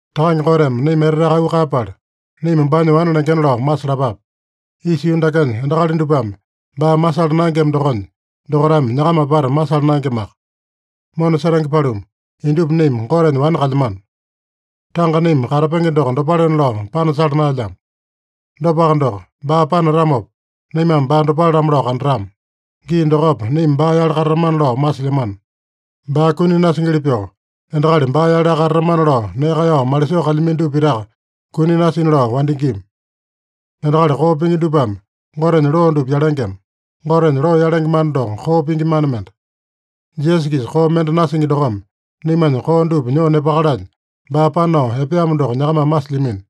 Takange Goteme naima eteteaka auu kaeyapala, naima baanya wane lengena lao masalapape. Isa yuu dakenya endakali dupame baa masala naengema dokonya, dokaitame nyakama apata masala naengemaka. Mona setenge paluma, indupa naima Gotenya wane kalyamano. Tanga naima katapenge doko dopalena lao panasala naelyamo. Dopaka doko, baa panatamopa naimame baa dopale-lamo lao kandatama. Gii dokopa naima baa-yale katatamana lao masilyamano. Baa kuni nasingili pyoo, endakali baa-yaleaka katatamana lao nee kaeyao malisoo kalyamino dupa pitaka kuni nasina lao wandingima. Endakali koo pingi dupame Gotenya loo dupa yalengema. Gotenya loo yalenge mana doko koo pingi mana mende. Jisasa-kisa koo mende nasingi dokome, naimanya koo dupa nyoo nepakalanya baa panao epeamo doko nyakamame masilyamino.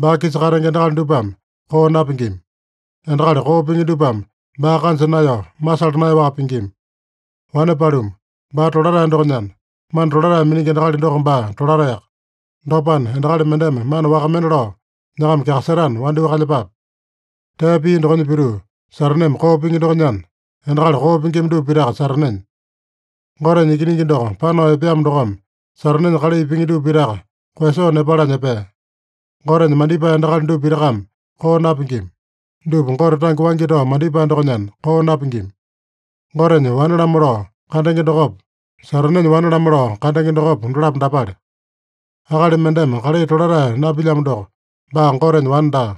Baa-kisa katenge endakali dupame koo napingima. Endakali koo pingi dupame baa kanja naeyao, masala naeyaowaka pingima. Wane paluma, baa tolatae dokonyana, mana tolatae miningi endakali doko baa tolataeyaka. Dopana, endakali mendeme mana waka mende lao nyakama kyakasetana, wandyoo kalyepape. Tee pia dokonya pituu, Sataneme koo pingi dokonyana, endakali koo pingima dupa pitaka Satanenya. Gotenya Ikiningi doko panao epeamo dokome, Satanenya kalai pingi dupa pitaka koeyasoo nepalanya epea. Gotenya mandipae endakali dupa pitakame koo napingima. Dupa Gote tange waingi tao mandipae dokonyana koo napingima. Gotenya wane-lamo lao kandenge dokopa, Satanenya wane-lamo lao kandenge dokopa, dolapo dapale: Akali mendeme kalai tolatae napilyamo doko, baa Gotenya wane daa.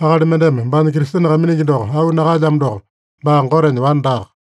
Akali mendeme baanya Kristene kaiminingi doko auu nakaelyamo doko, baa Gotenya wane daaka.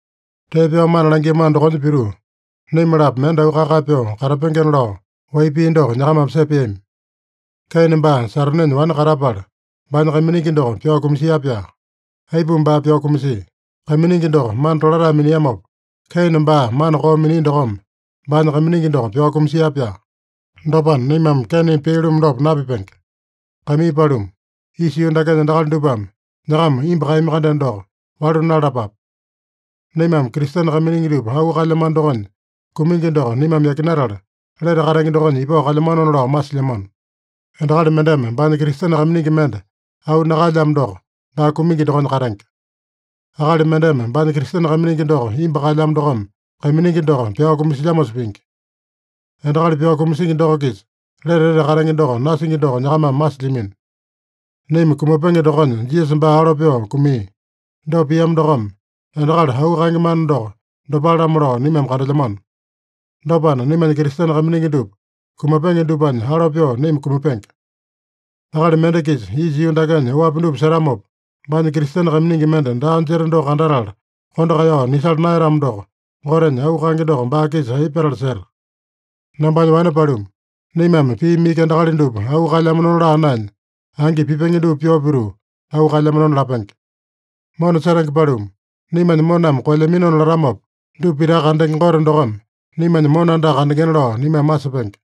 Tee pyao mana langiamano dokonya pituu, naima-lapo mende auu kae-kae pyoo katapengena lao wai pii doko nyakamame sepeami. Keine baa Satanenya wane katapala, baanya kaiminingi doko pyao kumasia-pyaa. Aipuma baa pyao kumasia? Kaiminingi doko mana tolatae miniamopa, Keine baa mana koo minia dokome, baanya kaiminingi doko pyao kumasia-pyaa. Dopana, naimame Keineme pia-lumu dopa napipenge. Kaimii paluma, isa yuu dakenya endakali dupame nyakama imbu kaeyami-kandeno doko, walu nalalapape. Naimame Kristene kaiminingi dupa auu kaelyamano dokonya, kumingi doko naimame yakinatala, lete katenge dokonya ipao kalyamanona lao masilyamano. Endakali mendeme baanya Kristene kaiminingi mende auu nakaelyamo doko, baa kumingi dokonya katenge. Akali mendeme baanya Kristene kaiminingi doko imbu kaelyamo dokome, kaiminingi doko pyao kumasilyamosa pingi. Endakali pyao kumasingi doko-kisa lete etete katenge doko nasingi doko nyakamame masilyamino. Naima kumapenge dokonya Jisasa baa alo pyoo kumia. Dopa piamo dokome, endakali auu kaenge mana doko dopale-lamo lao naimame kandelyamano. Dopana, naimanya Kristene kaiminingi dupa kumapenge dupanya alo pyoo naima kumapenge. Akali mende-kisa isa yuu dakenya oapi dupa setamopa, baanya Kristene kaiminingi mende daa jeta doko kandatala kondo kaeyao nisala naeyatamo doko, Gotenya auu kaenge doko baa-kisa aipa petala seta? Nambanya wane paluma, naimame piimi iki endakali dupa auu kaelyamanona laa naenya, angi pipenge dupa pyoo pituu auu kaelyamanona lapenge. Mona setenge paluma, naimanya moname koelyaminona latamopa, dupa pitaka kandenge Gote dokome naimanya mona andaka kandengena lao naimame masepenge.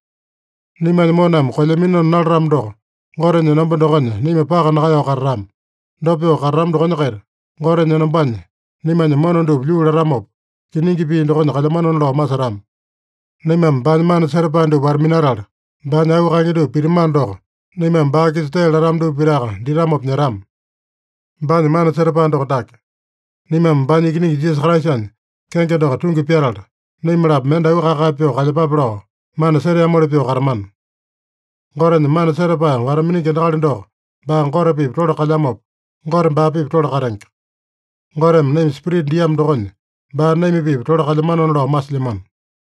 Naimanya moname koelyaminona nalatamo doko, Gotenya enomba dokonya naima paka nakaeyao katatama. Dopa pyoo katatama dokonya-kaita, Gotenya enombanya naimanya mona dupa lyuu latamopa, kiningi pii dokonya kalyamanona lao masetama. Naimame baanya mana setapae dupa wata-minatala, baanya auu kaenge dupa pitamano doko, naimame baa-kisa tee latama dupa pitaka ditamopa nyetama. Baanya mana setapae doko dake: Naimame baanya Ikiningi Jisasa Kraisanya kenge doko tungi pyatala, naima-lapo mende auu kae-kae pyoo kalyepape lao, mana seteamoli pyoo katamana. Gotenya mana setapae wata-miningi endakali doko baa Gote-pipa tole kalyamopa, Gote baa-pipa tole katenge. Goteme naima Spirita diamo dokonya, baa naima-pipa tole kalyamanona lao masilyamano.